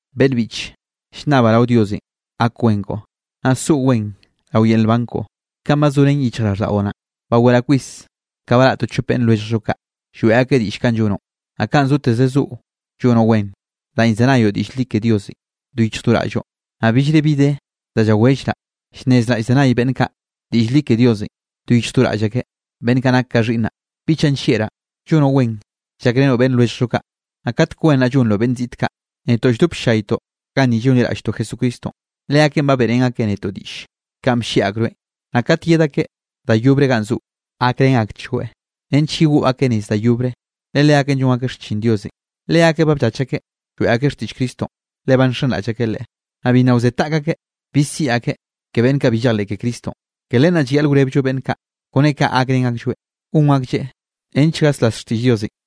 Beꞌnn biꞌche, llnnabaꞌ rao Diosenꞌ gak wen koꞌo, naꞌ soꞌo wen rao yel nban koꞌo, kanꞌ ba zorén yichjraꞌlldaꞌo naꞌ. Baweraꞌ kwis ka baraꞌ to chope beꞌnn lwelljllo kaꞌ, lloeꞌ akeꞌ diꞌll kanꞌ llonoꞌ, naꞌ kanꞌ zoteze zoꞌo llonoꞌ wen, danꞌ llzenayoꞌ diꞌll li ke Diosenꞌ do yichj do raꞌlloꞌ. Naꞌ billre bi de da llawellraꞌ llnnezraꞌ llzenay beꞌnn kaꞌ diꞌll li ke Diosenꞌ do yichj do raꞌll akeꞌ, beꞌnn kaꞌ nak ka xhiꞌnnaꞌ. Biꞌchaꞌ nllieꞌraꞌ, llonoꞌ wen llakrenoꞌ beꞌnn lwelljllo kaꞌ, naꞌ katek wen naꞌ llonroꞌ beꞌnn ziꞌte kaꞌ. Netoꞌ lldop ll-llaytoꞌ ganni llonliraꞌlltoꞌ Jesucristonꞌ, leakeꞌ ba beꞌrén akeꞌ netoꞌ diꞌlle kanꞌ bllieꞌ akroeꞌn. Naꞌ kat yed akeꞌ da yobre ganꞌ zoꞌo, gakrén akchgoeꞌ nench yegoꞌ akeꞌ nez da yobre, le leakeꞌn llon akeꞌ xchin Diosenꞌ. Leakeꞌ ba bllach akeꞌ lloeꞌ akeꞌ xtiꞌll Cristonꞌ, le ba nxenraꞌll akeꞌ Leꞌe. Naꞌ bi nna wze taꞌk akeꞌ, bi siꞌi akeꞌ ke beꞌnn kaꞌ bi llejleꞌ ke Cristonꞌ. Ke len naꞌ llayaꞌle wrebllo beꞌnn kaꞌ, kone kaꞌ gakrén aklloeꞌ gon aklleꞌ nench gaslas xtiꞌll Diosenꞌ.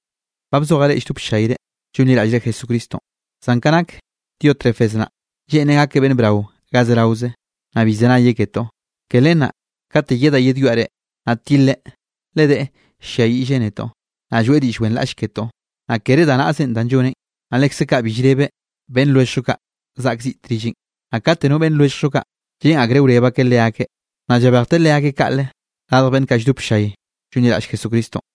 Ba bzojaꞌ reꞌ lldop ll-llayre llonliraꞌllre Jesucristonꞌ, zan ka nak Diótrefes naꞌ, lleꞌnreꞌ gakeꞌ beꞌnn brao ga zeraoze, naꞌ bi llzenayeꞌ ketoꞌ. Ke len naꞌ kate yedaꞌ yedwiaꞌ reꞌ, naꞌ tileꞌ, le deꞌe ll-lliayiꞌlleꞌ netoꞌ, naꞌ lloeꞌ diꞌll wenraꞌlle ketoꞌ. Naꞌ kere da naꞌzenꞌ danꞌ lloneꞌn, naꞌ lekze kaꞌ bi llrebeꞌ beꞌnn lwelljllo kaꞌ zaꞌk ziꞌte rilleꞌn, naꞌ kate no beꞌnn lwelljllo kaꞌ, lleꞌn akreꞌ wreb akeꞌ leakeꞌ, naꞌ llabejteꞌ leakeꞌ kaꞌle radj beꞌnn kaꞌ lldop ll-llay llonliraꞌll Jesucristonꞌ.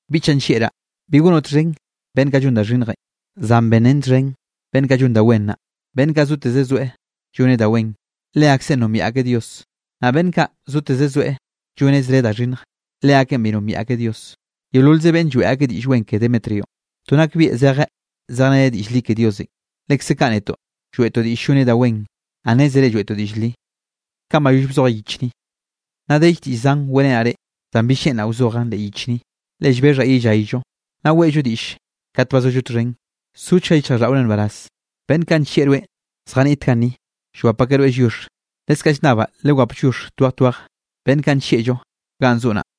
Biꞌchaꞌ nllieꞌraꞌ, bi gonoꞌ txhen beꞌnn kaꞌ llon da xhinnjenꞌ, zan benrén txhen beꞌnn kaꞌ llon da wen naꞌ. Beꞌnn kaꞌ zoteze zoeꞌ lloneꞌ da wen, leakseꞌn nombiaꞌ akeꞌ Dios, naꞌ beꞌnn kaꞌ zoteze zoeꞌ lloneꞌ zre da xhinnj, leakeꞌn bi nombiaꞌ akeꞌ Dios. Yeololze beꞌnn lloeꞌ akeꞌ diꞌll wen ke Demetrionꞌ, to nakbieꞌ zeje zejreneꞌ diꞌll li ke Diosenꞌ. Lekze kaꞌ netoꞌ lloeꞌtoꞌ diꞌll lloneꞌ da wen, naꞌ nnézere lloeꞌtoꞌ diꞌll li. Nna dell diꞌll zan weꞌrenaꞌ reꞌ, zan bill lleꞌnraꞌ wzojaꞌn leꞌ yich ni. Le llbexhaꞌ yellayllo, naꞌ weꞌllo diꞌll kat ba zollo txhen. Sochga yichjraꞌlldaꞌore nbaraz. Beꞌnn kaꞌ nllieꞌ rweꞌn zjaniꞌt ganni, llwap akeꞌ rweꞌ lliox. Leskaꞌ llnnabaꞌ lewap lliox twej twej, beꞌnn kaꞌ nllieꞌllo ganꞌ zoꞌo naꞌ.